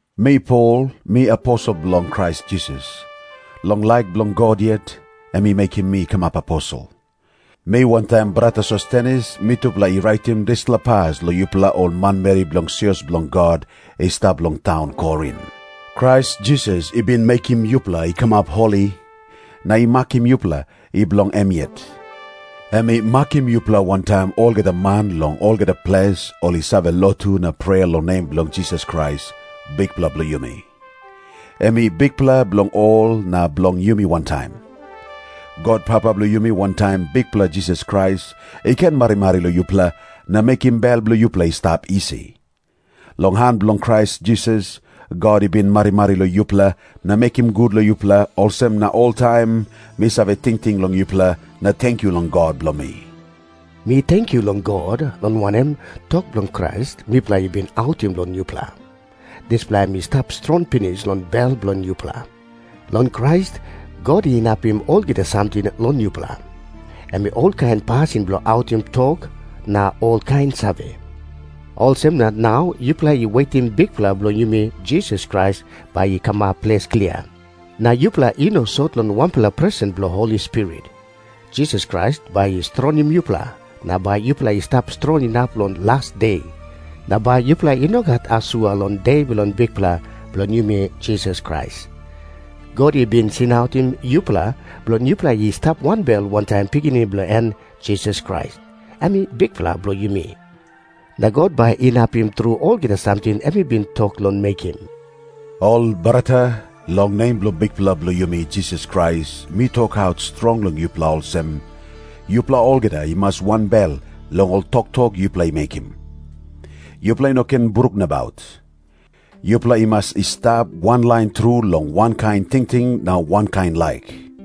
Mi Pol, mi aposel bilong Krais Jisas. Long laik bilong God yet, em i mekim mi i kamap aposel. Mi wantaim brata Sostenes mitupela i raitim dispela pas long yupela ol manmeri bilong sios bilong God i stap long taun Korin. Krais Jisas i bin mekim yupela i kamap holi, na i makim yupela i bilong em yet. Em i makim yupela wantaim olgeta man long olgeta ples ol i save lotu na prea long nem bilong Jisas Krais, Bikpela bilong yumi. Em i Bikpela bilong ol na bilong yumi wantaim. God Papa bilong yumi wantaim Bikpela Jisas Krais i ken marimari long yupela na mekim bel bilong yupela i stap isi. Long han bilong Krais Jisas, God i bin marimari long yupela na mekim gut long yupela, olsem na oltaim mi save tingting long yupela na tenkyu long God bilong mi. Mi tenkyu long God, long wanem, tok bilong Krais mipela i bin autim long yupela, dispela em i stap strong pinis long bel bilong yupela. Long Krais, God inapim olgeta samting long yupela, em olkain pasin bilong autim tok na olkain save. Olsem na nau yupela i wetim Bikpela bilong yumi Jisas Krais bai i kamap ples klia, na yupela i no sot long wanpela presen bilong Holi Spirit. Jisas Krais bai i strongim yupela, na bai yupela i stap strong inap long las de, na bai yupela i no gat asua long De bilong Bikpela bilong yumi Jisas Krais. God i bin singautim yupela bilong yupela i stap wanbel wantaim Pikinini bilong en Jisas Krais, em Bikpela bilong yumi. Na God bai inapim tru olgeta samting em i bin tok long mekim. Ol brata, long nem bilong Bikpela bilong yumi Jisas Krais mi tokaut strong long yupela olsem, yupela olgeta i mas wanbel long ol toktok yupela i mekim. Yupela i no ken bruk nabaut. Yupela i mas i stap wanlain tru long wankain tingting na wankain laik.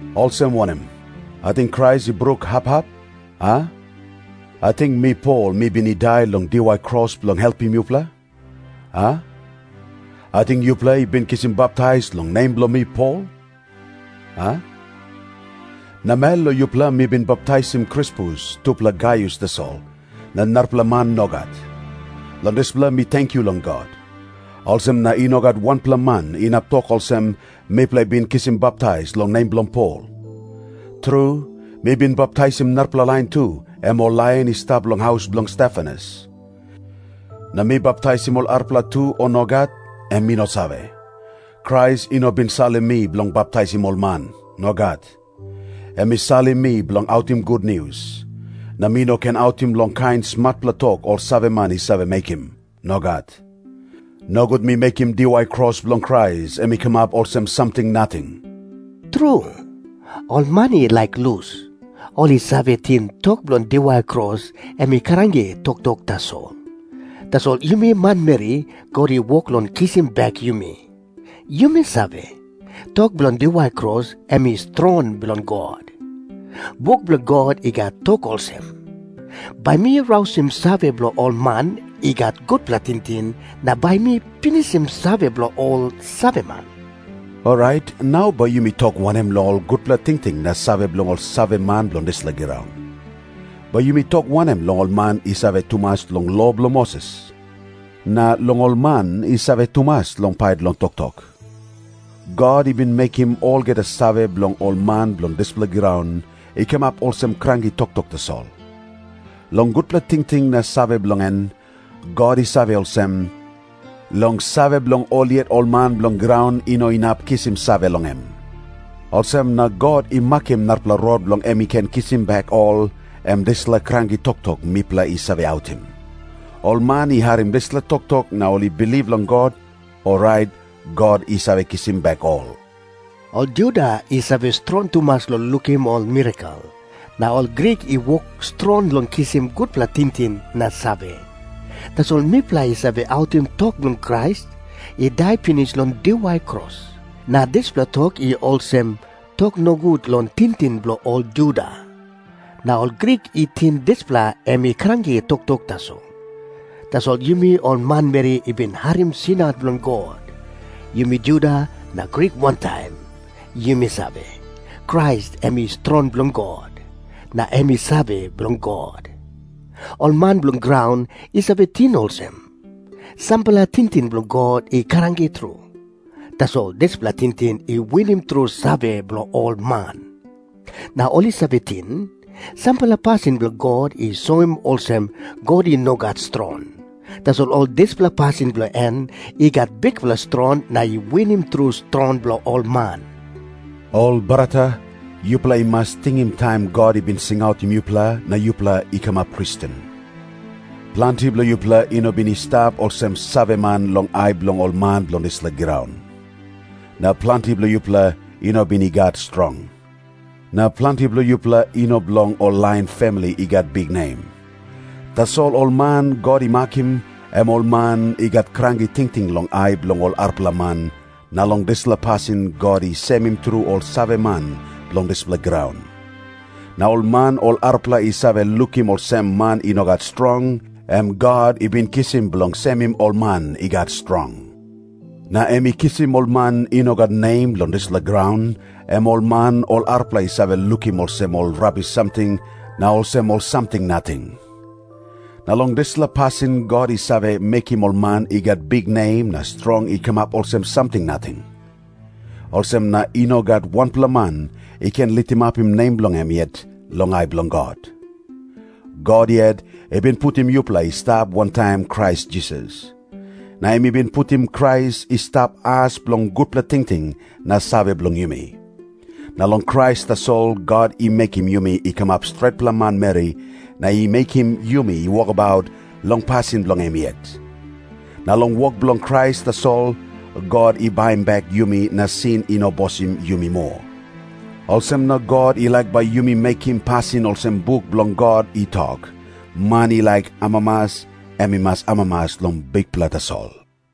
Olsem wanem? Ating Krais i bruk hap hap, a? Ating mi Pol mi bin i dai long diwai kros bilong helpim yupela, a? Ating yupela i bin kisim baptais long nem bilong mi Pol, a? Namel long yupela mi bin baptaisim Krispus tupela Gaius tasol, na narapela man nogat. Long dispela mi tenkyu long God. Olsem na i no gat wanpela man inap tok olsem, “Mipela i bin kisim baptais long nem bilong Pol.” Tru, mi bin baptaisim narapela lain tu, em ol lain i stap long haus bilong Stefanas. Na mi baptaisim ol arapela tu, o nogat, em mi no save. Krais i no bin salim mi bilong baptaisim ol man. Nogat. Em i salim mi bilong autim gutnius. Na mi no ken autim long kain smatpela tok ol saveman i save mekim. Nogat. Nogut mi mekim diwai kros bilong Krais em i kamap olsem samting nating. Tru, ol man i laik lus, ol i save ting tok bilong diwai kros em i kranki toktok tasol. Tasol yumi manmeri God i wok long kisim bek yumi, yumi save, tok bilong diwai kros em i strong bilong God. Buk bilong God i gat tok olsem, “Bai mi rausim save bilong ol man i gat gutpela tingting na bai mi pinisim save bilong ol saveman.” Orait nau bai yumi tok wanem long ol gutpela tingting na save bilong ol saveman bilong dispela graun? Bai yumi tok wanem long ol man i save tumas long lo bilong Moses? Na long ol man i save tumas long pait long toktok? God i bin mekim olgeta save bilong ol man bilong dispela graun i kamap olsem kranki toktok tasol. Long gutpela tingting na save bilong en, God i save olsem, long save bilong ol yet ol man bilong graun i no inap kisim save long em. Olsem na God i makim narapela rot bilong em i ken kisim bek ol, em dispela “kranki toktok” mipela i save autim. Ol man i harim dispela toktok na ol i bilip long God, orait God i save kisim bek ol. Ol Juda i save strong tumas long lukim ol mirakel, na ol Grik i wok strong long kisim gutpela tingting na save. Tasol mipela i save autim tok bilong Krais i dai pinis long diwai kros, na dispela tok i olsem tok nogut long tingting bilong ol Juda. Na ol Grik i ting dispela em i kranki toktok tasol. Tasol yumi ol manmeri i bin harim singaut bilong God, yumi Juda na Grik wantaim, yumi save, Krais em i strong bilong God, na em i save bilong God. Ol man bilong graun i save ting olsem, sampela tingting bilong God i kranki tru. Tasol dispela tingting i winim tru save bilong ol man. Na ol i save ting, sampela pasin bilong God i soim olsem God i no gat strong. Tasol ol dispela pasin bilong en i gat bikpela strong na i winim tru strong bilong ol man. Ol brata, yupela i mas tingim taim God i bin singautim yupela na yupela i kamap Kristen. Planti bilong yupela i no bin i stap olsem saveman long ai bilong ol man bilong dispela graun. Na planti bilong yupela i no bin i gat strong. Na planti bilong yupela i no bilong ol lain famili i gat biknem. Tasol ol man God i makim, em ol man i gat kranki tingting long ai bilong ol arapela man, na long dispela pasin God i semim tru ol saveman bilong dispela graun. Na ol man ol arapela i save lukim olsem man i no gat strong, em God i bin kisim bilong semim ol man i gat strong. Na em i kisim ol man i no gat nem long dispela graun, em ol man ol arapela i save lukim olsem ol rabis samting na olsem ol samting nating. Na long dispela pasin God i save mekim ol man i gat biknem na strong i kamap olsem samting nating. Olsem na i no gat wanpela man i ken litimapim nem bilong em yet long ai bilong God. God yet i bin putim yupela i stap wantaim Krais Jisas. Na em i bin putim Krais i stap as bilong gutpela tingting na save bilong yumi. Na long Krais tasol God i mekim yumi i kamap stretpela manmeri na i mekim yumi i wokabaut long pasin bilong em yet. Na long wok bilong Krais tasol God i baim bek yumi na sin i no bosim yumi moa. Olsem na God i laik bai yumi mekim pasin olsem buk bilong God i tok, “Man i laik amamas, em i mas amamas long Bikpela tasol.”